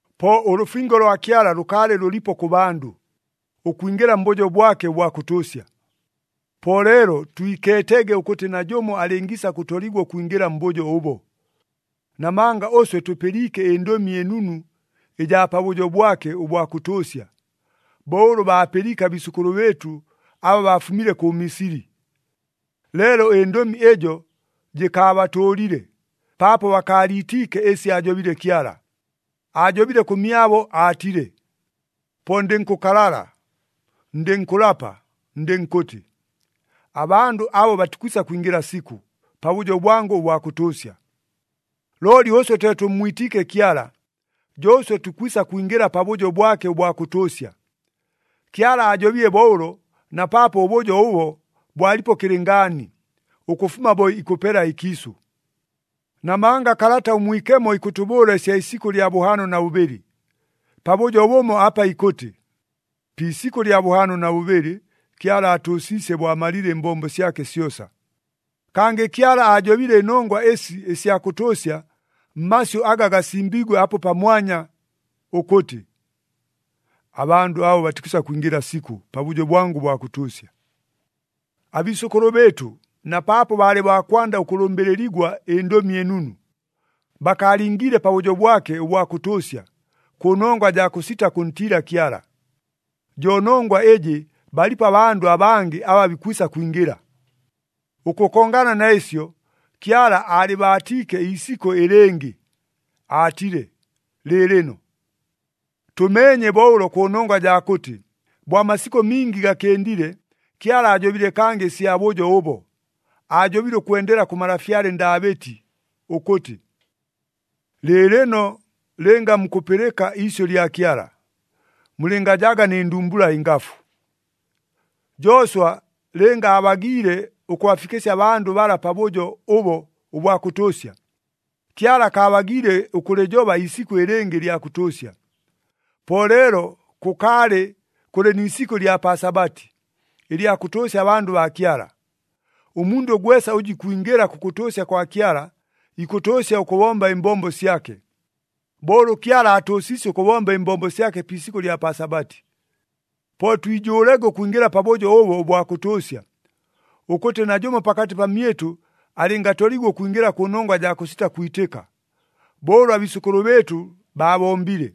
Po ʉlʉfingo lwa Kyala lʉkaalɨ lʉlipo kʉ bandʉ, ʉkwingɨla mbʉjo bwake ʉbwa kʉtʉʉsya. Po leelo twikeetege ʉkʉtɨ najʉmo alɨngiisa kʉtoligwa ʉkwingɨla mbʉjo ʉbo. Namanga ʉswe tʉpɨliike ɨNdʉmi ɨNunu ɨjaa pabʉjo bwake ʉbwa kʉtʉʉsya, bo ʉlʉ baapɨliike abiisʉkʉlʉ bɨɨtʉ aba baafumile kʉ Misili. Leelo ɨndʉmi ɨjo jɨkaabatʉʉlile, paapo bakaaliitiike ɨsi aajobile Kyala. Aajobile kʉmyabo aatile, “Po ndɨnkʉkalala, ndɨnkʉlapa, ndɨnkʉtɨ, ‘Abandʉ abo batikwisa kwingɨla sikʉ, pabʉjo bwangʉ ʉbwa kʉtʉʉsya.’” Looli ʉswe twe tʉmmwitiike Kyala, jo ʉswe tukwisa kwingɨla pabʉjo bwake ʉbwa kʉtʉʉsya. Kyala aajobile bo ʉlo, na paapo ʉbʉjo ʉbo bwalipo kɨlɨngaani, ʉkʉfuma bo ikʉpela ɨkiisʉ. Namanga Kalata ʉMwikemo ikʉtʉbʉʉla ɨsya isikʉ lya bʉhaano na bʉbɨlɨ, pabʉjo bʉmo apa ikʉtɨ, “Pi isikʉ lya bʉhaano na bʉbɨlɨ, Kyala aatʉʉsiisye bo amalile ɨmbombo syake syosa.” Kangɨ Kyala aajobile ɨnongwa ɨsi ɨsya kʉtʉʉsya mmasyʉ aga gasimbiigwe apo pamwanya, ʉkʉtɨ, “Abandʉ abo batikwisa kwingɨla sikʉ, pabʉjo bwangʉ ʉbwa kʉtʉʉsya.” Abiisʉkʉlʉ bɨɨtʉ, na paapo baalɨ baa kwanda ʉkʉlʉmbɨlɨligwa ɨNdʉmi ɨNunu, bakaalingiile pabʉjo bwake ʉbwa kʉtʉʉsya, kʉnongwa jaa kʉsita kʉntiila Kyala. Jo nongwa ɨjɨ balipo abandʉ abangɨ aba bikwisa kwingɨla. Ʉkʉkongana na ɨsyo, Kyala aalɨbaatiike iisikʉ ɨlɨngɨ, aatile, “Lɨɨlɨno”. Tʉmeenye bo ʉlo kʉnongwa jaa kʉtɨ, bo amasikʉ mingi gakɨndile, Kyala aajobile kangɨ ɨsya bʉjo ʉbo, aajobile ʉkwendela kʉ malafyale Ndaabɨti ʉkʉtɨ, “Lɨɨlɨno, lɨnga mukʉpɨlɨka iisyʉ lya Kyala, mulɨngajaga nɨ ndumbula ɨngafu.” Jooswa lɨnga aabagiile ʉkʉbafikɨsya abandʉ bala pabʉjo ʉbo ʉbwa kʉtʉʉsya, Kyala akaabagiile ʉkʉlɨjoba iisikʉ ɨlɨngɨ ɨlya kʉtʉʉsya. Po leelo kʉkaalɨ kʉlɨ ni isikʉ ɨlya pa Sabati, ɨlya kʉtʉʉsya abandʉ baa Kyala. Ʉmundʉ gwesa ʉjʉ ikwingɨla kʉkʉtʉʉsya kwa Kyala, ikʉtʉʉsya ʉkʉbomba ɨmbombo syake, bo ʉlʉ Kyala aatʉʉsiisye ʉkʉbomba ɨmbombo syake pi isikʉ ɨlya pa Sabati. Po twijʉʉlege ʉkwingɨla pabʉjo ʉbo ʉbwa kʉtʉʉsya, ʉkʉtɨ najʉmo pakatɨ pamyɨtʉ alɨngatoligwa ʉkwingɨla kʉnongwa jaa kʉsita kwitɨka, bo ʉlʉ abiisʉkʉlʉ bɨɨtʉ baabombile.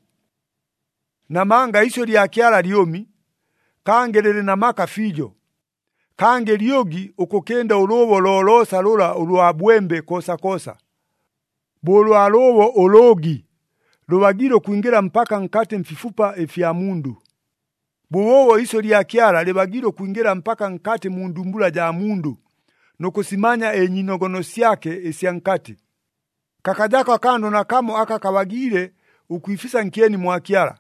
Namanga iisyʉ lya Kyala lyʉmi, kangɨ lɨlɨ na maka fiijo. Kangɨ lyʉgi ʉkʉkɨnda ʉlʉʉbo loloosa lʉla ʉlwa bwembe koosakoosa. Bo ʉlwa lʉʉbo ʉlʉʉgi lʉbagiile ʉkwingɨla mpaka nkatɨ mfifupa ɨfya mundʉ, bʉbʉʉbo iisyʉ lya Kyala lɨbagiile ʉkwingɨla mpaka nkatɨ mu ndumbula jaa mundʉ, nʉ kʉsimanya ɨnyiinogono syake ɨsya nkatɨ. Kakajako akandʉ nakamo aka kabagiile ʉkwifisa nkyeni mwa Kyala.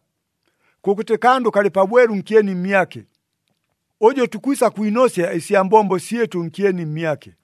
Kʉkʉtɨ kandʉ kalɨ pabwelu nkyeni mmyake, ʉjʉ tukwisa kwinosya ɨsya mbombo syɨtʉ nkyeni mmyake.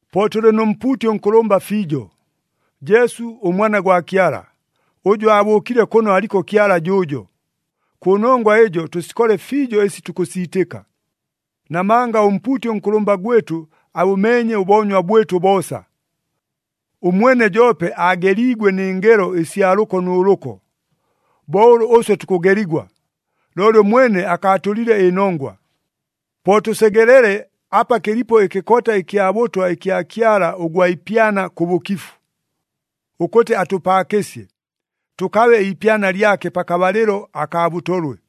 Po tʉlɨ nʉ mpuuti ʉnkʉlʉmba fiijo, Jesu ʉMwana gwa Kyala, ʉjʉ abʉʉkile kʉno aliko Kyala jʉʉjo. Kʉnongwa ɨjo tʉsikole fiijo ɨsi tukʉsiitɨka. Namanga ʉmpuuti ʉnkʉlʉmba gwɨtʉ abʉmeenye ʉboonywa bwɨtʉ boosa. Ʉmwene joope aageliigwe nɨ ngelo ɨsya lʉko nʉ lʉko, bo ʉlʉ ʉswe tukʉgeligwa, looli ʉmwene akaatʉlile ɨnongwa. Po tʉsegelele apa kɨlipo ɨkɨkota ɨkya bʉtwa ɨkya Kyala ʉgwa ipyana kʉ bʉkifu, ʉkʉtɨ atʉpaakɨsye, tʉkabe iipyana lyake pakabalɨlo akaa bʉtolwe.